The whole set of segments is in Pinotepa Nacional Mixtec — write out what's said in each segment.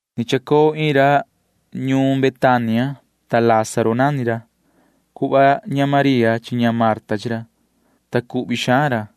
Ni chacoo iin ra ñuun Betania, ta Lázaro nani ra. Cuhva ña María chi ña Marta chi ra, ta cuhvi xaan ra.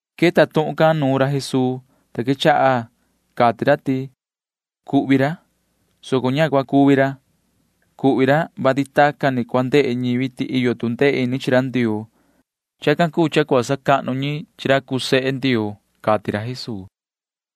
Queta tuhun can nuun ra Jesuu, ta quechaha cati ra ti: ―Cuhvi ra, soco ña cua cuvi ra. Cuhvi ra, vati tacan ni cua ndehe ñivi ti iyo tu ndee ini chi ra Ndioo. Chacan cuu cha cua sacahnu ñi chi ra cuu sehe Ndioo ―cati ra Jesuu.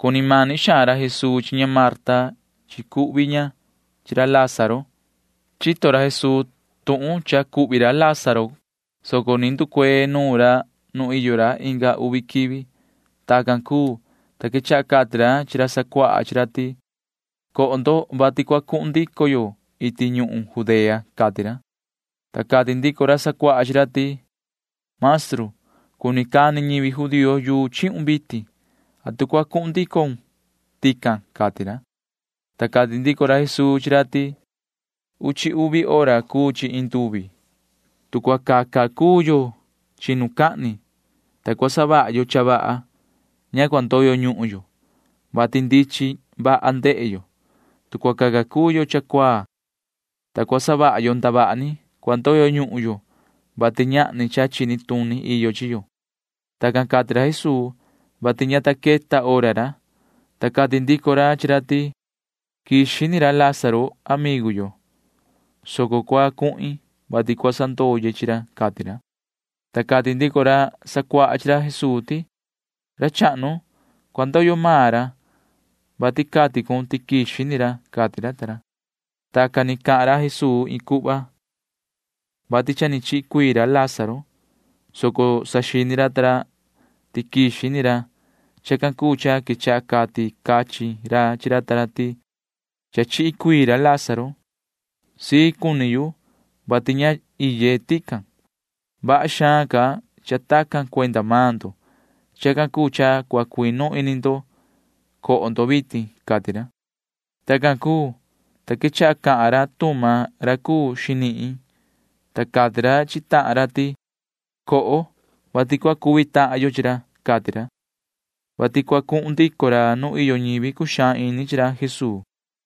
Cuni mani xaan ra Jesuu chi ña Marta chi cuhvi ña chi ra Lázaro. Chini ra Jesuu tuhun cha cuhvi ra Lázaro can, soco ni nducuee nuun ra nu iyo ra inga uvi quivi. Tacan cuu, ta quechaha cati ra chi ra sacuaha chi ra ti: ―Coho, vati cua cuhun ndico yo iti ñuhun Judea ―cati ra. Ta cati ndico ra sacuaha chi ra ti: ―Maestru, cuni cani ñivi judío yuu chihun vitin. ¿Atu cua cuhun ndicon tican? ―cati ra. Ta cati ndico ra Jesuu chi ra ti: ―Uchi uvi hora cuu chi iin nduvi. Tu cua caca cuu yo chinucahni, [ta cua savaha yo cha vaha,] ña cua ndoyo ñuhun yo, vati ndichin vaha ndehe yo. Tu cua caca cuu yo cha cuaa, ta cua savaha yo ndavaha ni, cua ndoyo ñuhun yo, vati ñahni cha chini tuni iyo chi yo. Tacan cati ra Jesuu, [vati ña ta queta hora ra,] ta cati ndico ra chi ra ti: ―Quixi ni ra Lázaro amigu yo, soco cua cuhin, vati cua sandoye chi ra ―cati ra. Ta cati ndico ra sacuaha chi ra Jesuu ti: ―Ra chahnu, cua ndoyo maan ra, vati cati cun ti quixi ni ra ―cati ra ta ra. Tacan ni cahan ra Jesuu iin cuhva, vati cha ni chihi cuii ra Lázaro, soco saxini ra ta ra ti quixi ni ra. Chacan cuu cha quechaha cati cachin ra chi ra ta ra ti: ―Cha chihi cuii ra Lázaro, ta cusii ini yu, vati ña iye tican. Vaha xaan ca cha tacan cuenda maan ndo. Chacan cuu cha cua cuinu ini ndo. Na coho vitin ―cati ra. Tacan cuu, ta quechaha cahan ra Tuma ra cuu xinihin, ta cati ra chi tahan ra ti: ―Coho, vati cua cuvi tahan yo chi ra ―cati ra, [vati cua cuhun ndico ra nu iyo ñivi cuxaan ini chi ra Jesuu].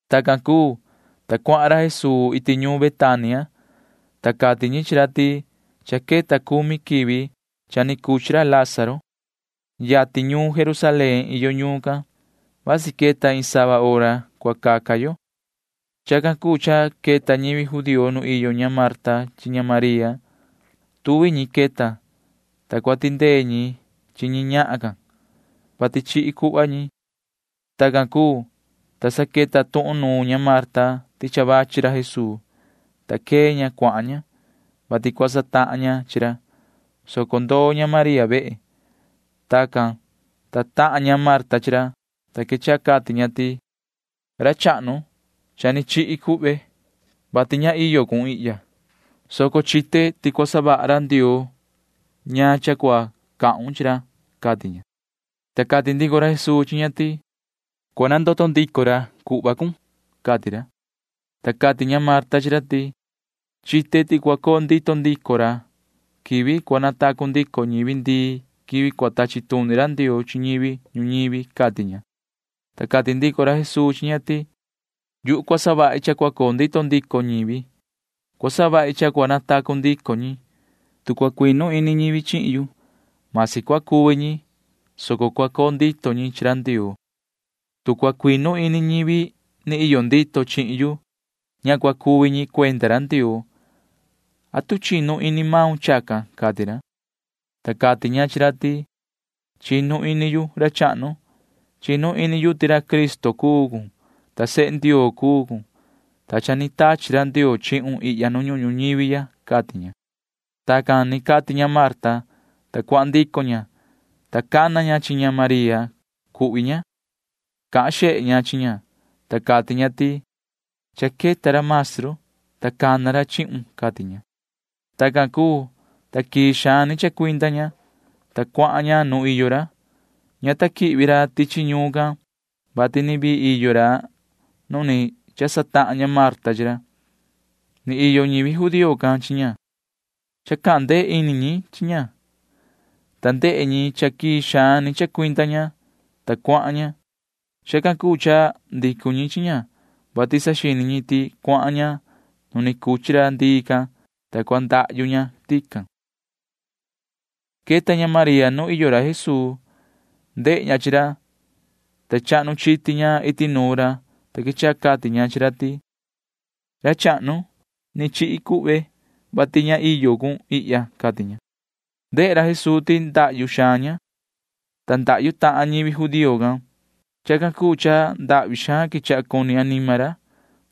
Tacan cuu, ta cuahan ra Jesuu iti ñuun Betania, ta cati ñi chi ra ti cha queta cumi quivi cha ni cuchi ra Lázaro. Yatin ñuun Jerusalén iyo ñuun can. Vasi queta iin sava hora caca yo. Chacan cuu cha queta ñivi judío nu iyo ña Marta chi ña María. Tuvi ñi queta, ta cua tindee ñi chi ñi ñahan can, vati chihi cuhva ñi. Tacan cuu, ta sa queta tuhun nuun ña Marta ti cha vachi ra Jesuu, ta quee ña cuahan ña, vati cua satahan ña chi ra, soco ndoo ña María vehe. Tacan, ta tahan ña Marta chi ra, ta quechaha cati ña ti: ―Ra chahnu, cha ni chihi cuhve, vati ña iyo cun ihya, soco chite ti cua savaha ra Ndioo ñaan cha cua cahun chi ra ―cati ña. Ta cati ndico ra Jesuu chi ña ti: ―Cua nandoto ndico ra cuhvon ―cati ra. Ta cati ña Marta chi ra ti: ―Chite ti cua coo ndito ndico ra quivi cua natacu ndico ñivi ndii quivi cua tachi tuni ra Ndioo chi ñivi ñuñivi ―cati ña. Ta cati ndico ra Jesuu chi ña ti: ―Yuhu cua savahi cha cua coo ndito ndico ñivi. Cua savahi cha cua natacu ndico ñi. Tu cua cuinu ini ñivi chihin yu, masi cua cuvi ñi, soco cua coo ndito ñi chi ra Ndioo. Tu cua cuinu ini ñivi ni iyo ndito chihin yu, ña cua cuvi ñi cuenda ra Ndioo. ¿Atu chinu ini maun chacan? ―cati ra. Ta cati ña chi ra ti: ―Chinu ini yu, ra chahnu. Chinu ini yu ti ra Cristo cuun, ta sehe Ndioo cuun, ta cha ni tachi ra Ndioo chihun ihya nu ñuhun ñuñivi ya ―cati ña. Tacan ni cati ña Marta, ta cuahan ndico ña, ta cana ña chi María cuhvi ña. Cahan xehe ña chi ña, ta cati ña ti: ―Cha queta ra maestru, ta cana ra chihun ―cati ña. Tacan cuu, ta quii xaan ni chacuinda ña, ta cuahan ña nu iyo ra. Ña ta quihvi ra tichi ñuun can, vati ni vii iyo ra nu ni cha satahan ña Marta chi ra. Ni iyo ñivi judío can chi ña, ta chaha ñi tu ndee ini chi ña. Ndehe ñi ti quii xaan ni chacuinda ña, ta cuahan ña. Chacan cuu cha ndicu ñi chi ña, vati saxini ñi ti cuahan ña nu ni cuchi ra ndii can, ta cua ndahyu ña tican. Queta ña María nu iyo ra Jesuu. Ndehe ña chi ra, ta sa chahnu chiti ña iti nuun ra, ta quechaha cati ña chi ra ti: ―Ra chahnu, ni chihi cuhve, vati ña iyo cun ihya ―cati ña. Ndehe ra Jesuu ti chacu xaan ña, ta chacu tahan ñivi judío can. Chacan cuu cha ndahvi xaan quechaha cuni anima ra. Ña vaha cuni ra,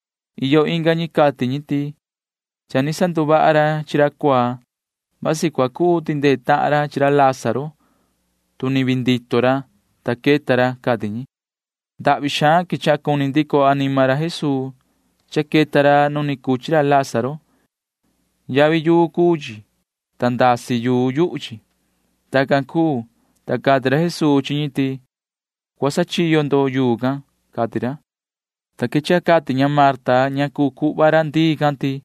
Iyo inga ñi cati ñi ti: ―Cha ni sanduvaha ra chi ra cuaa. Vasi cua cuu tindee tahan ra chi ra Lázaro, tu ni vii ndito ra, ta queta ra ―cati ñi. Ndahvi xaan quechaha cuni ndico anima ra Jesuu cha queta ra nu ni cuchi ra Lázaro. Yavi yuu cuu chi, ta ndasi yuu yuhu chi. Tacan cuu, ta cati ra Jesuu chi ñi ti: ―Cua sachiyo ndo yuu can ―cati ra. Ta quechaha cati ña Marta ña cuu cuhva ra ndii can ti: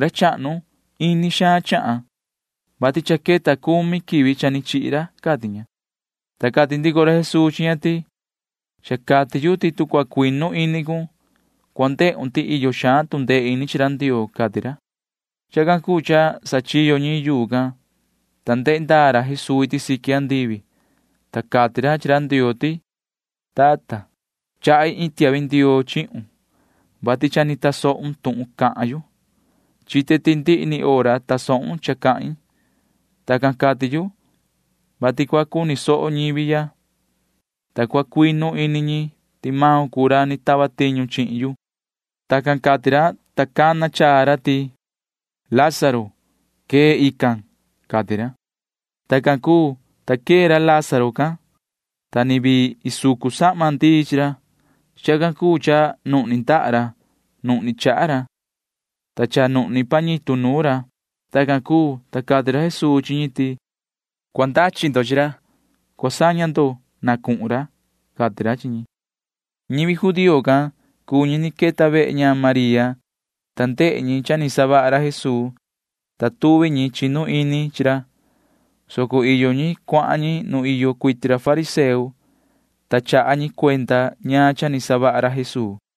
―Ra chahnu, ini xaan chahan, vati cha queta cumi quivi cha ni chihi ra ―cati ña. Ta cati ndico ra Jesuu chi ña ti: ―Cha cati yu ti tu cua cuinu ini cun, cua ndehun ti iyo xaan tu ndee ini chi ra Ndioo ―cati ra. Chacan cuu cha sachiyo ñi yuu can, ta ndehe ndaa ra Jesuu iti siqui andivi, ta cati ra chi ra Ndioo ti: ―Tata, chahi iin tiahvi ndioo chihun, vati cha ni tasohun tuhun cahan yu. Chite ti ndihi ni hora tasohun cha cahin. Tacan cati yu, vati cua cuni soho ñivi ya, ta cua cuinu ini ñi ti maun cuu ra ni tava tiñu chihin yu. Tacan cati ra, ta sa cana chaa ra ti: ―Yoho Lázaro, quee, xaa ―cati ra. Tacan cuu, ta quee ra Lázaro can, ta ni vii isucu sahma ndii chi ra. Chacan cuu cha nuhni ndaha ra. Nuhni chaha ra, ta cha nuhni pañitu nuun ra. Tacan cuu, ta cati ra Jesuu chi ñi ti: ―Cua ndachi ndo chi ra. Cua saña ndo na cuhun ra ―cati ra chi ñi. Ñivi judío can cuu ñi ni queta vehe ña María, ta ndehe ñi cha ni savaha ra Jesuu, ta tuvi ñi chinu ini chi ra, soco iyo ñi cuahan ñi nu iyo cuiti ra fariseo, ta chaha ñi cuenda ñaan cha ni savaha ra Jesuu.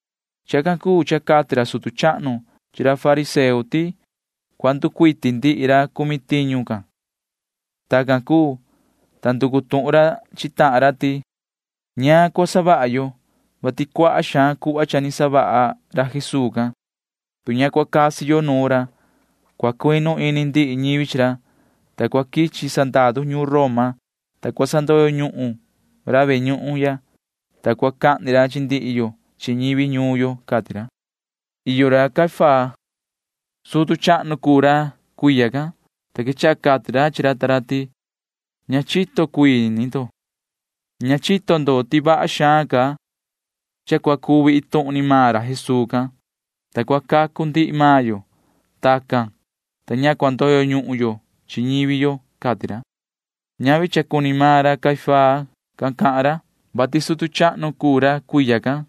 Chacan cuu cha cati ra sutu chahnu chi ra fariseo ti cua nducuiti ndihi ra cumi tiñu can. Tacan cuu, ta nducu tuhun ra chi tahan ra ti: ―¿Ñaan cha cuu cha cua savaha yo, vati cuaha xaan cuhva cha ni savaha ra Jesuu can? Tu ña cua casi yo nuun ra, cua cuinu ini ndihi ñivi chi ra, ta cua quichi sandaru ñuun Roma, ta cua sandoyo ñuhun ra ve ñuhun ya, ta cua cahni ra chi ndihi yo chi ñivi ñuun yo ―cati ra. Iyo ra Caifás. Sutu chahnu cuu ra cuiya can, ta quechaha cati ra chi ra ta ra ti: ―Ña chito cuii ni ndo. Ña chito ndo ti vaha xaan ca cha cua cuvi iin tuhun ni maan ra Jesuu can, ta cua cacu ndihi maan yo. Tacan, ta ña cua ndoyo ñuhun yo chi ñivi yo ―cati ra. Ñavi cuenda suvi ni maan ra cahan ra Caifás can, vati sutu chahnu cuu ra cuiya can.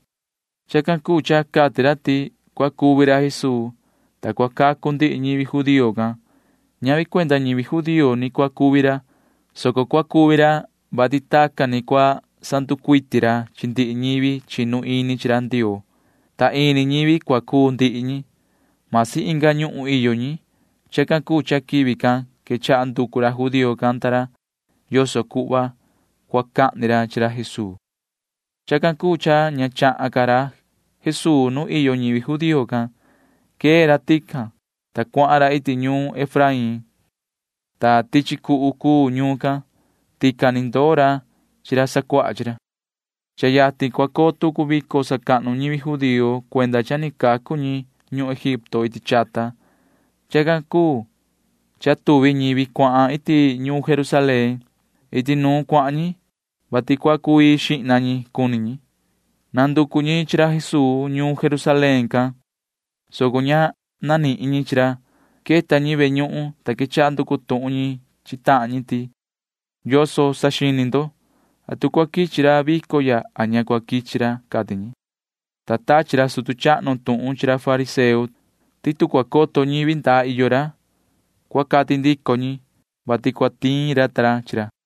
Chacan cuu cha cati ra ti cua cuvi ra Jesuu, ta cua cacu ndihi ñivi judío can. Ñavi cuenda ñivi judío ni cua cuvi ra, soco cua cuvi ra, vati tacan ni cua sanducuiti ra chi ndihi ñivi chinu ini chi ra Ndioo, ta ini ñivi cua cuu ndihi ñi ―masi inga ñuhun iyo ñi. Chacan cuu cha quivi can quechaha nducu ra judío can cuhva yoso cuhva cua cahni ra chi ra Jesuu. Chacan cuu cha ña chahan ca ra Jesuu nu iyo ñivi judío can. Quee ra tican, ta cuahan ra iti ñuun Efraín, ta tichi cuhu cuu ñuun can. Tican ni ndoo ra chi ra sacuaha chi ra. Cha yatin cua coo tucu vico sacahnu ñivi judío cuenda cha ni cacu ñi ñuhun Egipto iti chata. Chacan cuu cha tuvi ñivi cuahan iti ñuun Jerusalén. Iti nuun cuahan ñi, vati cua cu‑ii xihna ñi cuni ñi. Nanducu ñi chi ra Jesuu ñuun Jerusalén can, soco ña nanihin ñi chi ra. Queta ñi ve ñuhun, ta quechaha nducu tuhun ñi chi tahan ñi ti: ―¿Yoso saxini ndo? ¿Atu cua quichi ra vico ya a ña cua quichi ra? ―cati ñi. Ta cha tachi ra sutu chahnu chi ra fariseo tuhun, vati tu cua coto ñivi ndaa iyo ra, cua cati ndico ñi, vati cua tiin ra ta ra chi ra.